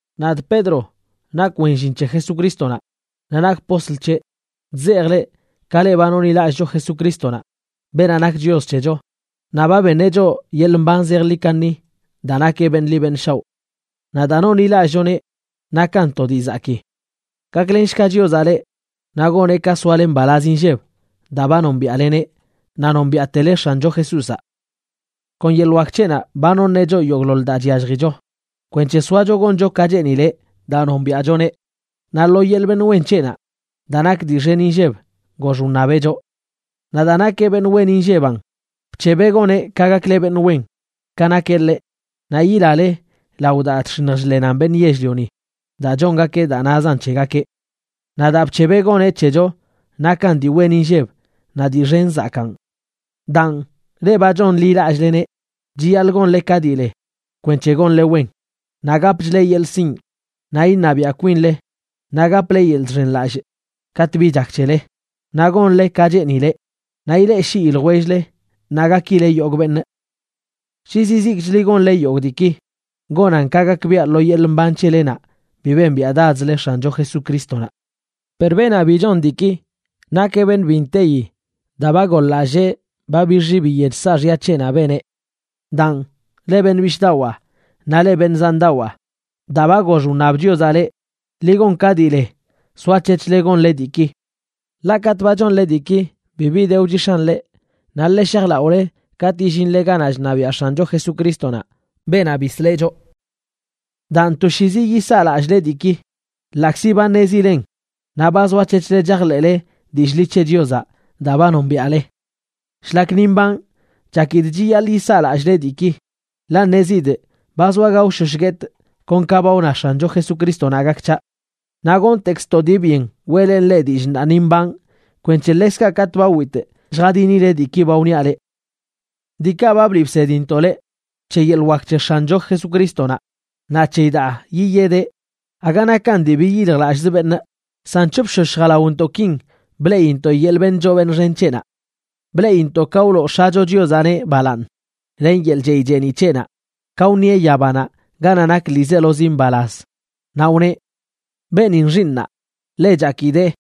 Nadꞌ Pedro, nakꞌ wen llin c̱he Jesucrístonaꞌ naꞌ nakꞌ postl c̱heꞌ. Chzejꞌ leꞌ, ka leꞌ ba nonḻilallꞌcho Jesucrístonaꞌ, beenaꞌ nak Chios c̱hecho naꞌ ba beṉeꞌ choꞌ yeḻꞌ mban zejḻi kaṉi daa nakeꞌ beṉꞌ ḻi beṉꞌ shaoꞌ. Naꞌ daa nonḻilallꞌchoneꞌ nakan to dii zakii. Gaklenshga Chiozaꞌ leꞌ naꞌ goneꞌ ka soale mbalaz inlleb daa ba nombiaꞌleneꞌ naꞌ nombiaꞌtele X̱ancho Jesúzaꞌ. Kon yeḻꞌ wak c̱heꞌnaꞌ ba noṉeꞌ choꞌ yogꞌḻoḻ daa chyalljicho kwenc̱he soacho goncho ka cheenileꞌ daa nombiaꞌchoneꞌ, naꞌ lo yeḻꞌ beṉꞌ wen c̱heꞌnaꞌ, daa nak dii xen inlleb, gox wṉabeꞌ choꞌ. Naꞌ daa nakeꞌ beṉꞌ wen inlleban, bc̱hebeꞌ goneꞌ ka gakle beṉꞌ wen ka nakeꞌ ḻeꞌ, naꞌ yilale lao daa chx̱iṉj chḻenan beṉꞌ yell-lioni daa chongakeꞌ daa nazan c̱hegakeꞌ. Naꞌ daa bc̱hebeꞌ goneꞌ c̱hecho nakan dii wen inlleb naꞌ dii xen zakaꞌn. Daan, leꞌ ba chonḻilallꞌleneꞌ chiyaḻꞌ gonle ka dii le kwenc̱he gonle wen, naꞌ gapchle yeḻꞌ sinꞌ, naꞌ iṉabiaꞌ kwinle, naꞌ gaple yeḻꞌ chxenlallꞌ katꞌ bi chak c̱hele, naꞌ gonle ka cheenileꞌ, naꞌ ileꞌshii ljwell-le naꞌ gakile yogꞌ beṉꞌ. Shi zizikchli gonle yogꞌ diiki, gonan ka gakbiaꞌ lo yeḻꞌ mban c̱helenaꞌ bi bembiaꞌdadzle X̱ancho Jesucrístonaꞌ. Per beenaꞌ bi chon diiki, nakeꞌ beṉꞌ bi nteyi daa ba goḻ-lallee ba bixi biyech saaxya c̱heꞌnaꞌ beneꞌ. Daan, leꞌ beṉꞌ bishꞌdawaa naꞌ leꞌ beṉꞌ zandawaa, daa ba gox wṉab Chiozaꞌ leꞌ, ḻi gon ka dii le soac̱hec̱hle gonle diiki. Ḻaꞌ katꞌ ba chonle diiki bibi de wchix̱an leꞌ, naꞌ ḻe shajlaꞌole katꞌ yillinle ganaꞌ chṉabiaꞌ X̱ancho Jesucrístonaꞌ, beenaꞌ bisleꞌ choꞌ. Daan, toshiizi yisaa lallꞌle diiki, ḻaꞌkzi ba ṉezilen naꞌ ba zoac̱hec̱hle chajḻeꞌle dillꞌ ḻi c̱he Chiozaꞌ daa ba nombiaꞌle. Shlak ni mbanꞌ, chakidꞌ chiyaḻꞌ yisaa lallꞌle diiki, ḻaꞌ ṉezidꞌ ba zoa gaoshosh guetꞌ kon ka ba wna X̱ancho Jesucrístonaꞌ gak c̱haꞌ. Naꞌ gontekzꞌ to dii byen weꞌlenꞌ leꞌ dillꞌ ṉaa ni mbanꞌ kwenc̱he ḻekzkaꞌ katꞌ ba witꞌ lljadinileꞌ diiki ba wniaꞌ leꞌ. Diikaꞌ ba bliꞌ bsedintoꞌ leꞌ c̱he yeḻꞌ wak c̱he X̱ancho Jesucrístonaꞌ naꞌ c̱heyi daa yiyedeꞌ, aga nakan dii biyiljlallꞌzə beṉꞌ, san c̱hopshosh jalaontoꞌkin bleꞌintoꞌ yeḻꞌ beṉꞌ choo beṉꞌ xen c̱heꞌnaꞌ. Bleꞌintoꞌ ka wloo X̱acho Chiozaꞌneꞌ balaaṉ len yeḻꞌ chey cheeniꞌ c̱heꞌnaꞌ ka wṉieꞌ yabanaꞌ ganaꞌ nak ḻiizelozi mbalaz, naꞌ wneꞌ: “Beenin xiiṉaa, ḻe chakidee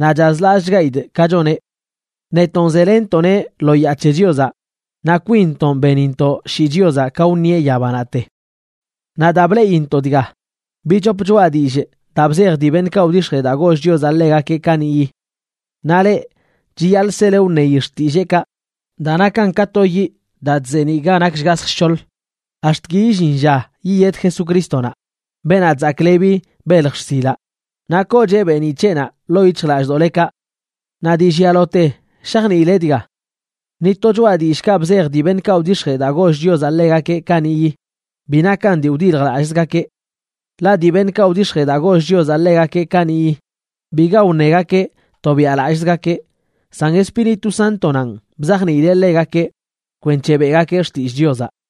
naꞌ chazlallꞌchgaidꞌ ka choneꞌ.” Netonꞌ zelenntoꞌneꞌ lo yaa c̱he Chiozaꞌ naꞌ kwinntonꞌ benintoꞌ shii Chiozaꞌ ka wṉieꞌ yabanaꞌte. Naꞌ daa bleꞌintoꞌ dga, bichop choꞌa dillꞌ daa bzej dii beṉꞌkaꞌ wdix̱jee daa goll Chiozaꞌ ḻegakeꞌ kaniꞌyi. Naꞌ leꞌ, chiyaḻꞌ sele wṉeyi xtilleekaꞌ, daa nakan ka to yiꞌ daa chzeeniꞌ ga nak shgasj shc̱hoḻ, ax̱t ki illin lla yiyed Jesucrístonaꞌ, beenaꞌ chzaklebi belj xsilaꞌ, naꞌ koocheꞌ beeniꞌ c̱heꞌnaꞌ ḻoo yic̱hjlallꞌdoꞌlekaꞌ. Naꞌ dii llialote shajniile dga: ni to choꞌa dillꞌkaꞌ bzej dii beṉꞌkaꞌ wdix̱jee daa goll Chiozaꞌ ḻegakeꞌ kaniꞌyi bi nakan dii wdiljlallꞌzgakeꞌ. Ḻaꞌ dii beṉꞌkaꞌ wdix̱jee daa goll Chiozaꞌ ḻegakeꞌ kaniꞌyi, biga wṉegakeꞌ tobiaꞌlallꞌzgakeꞌ, san Espíritu Sántonanꞌ bzajniileꞌ ḻegakeꞌ kwenc̱he beꞌgakeꞌ xtillꞌ Chiozaꞌ.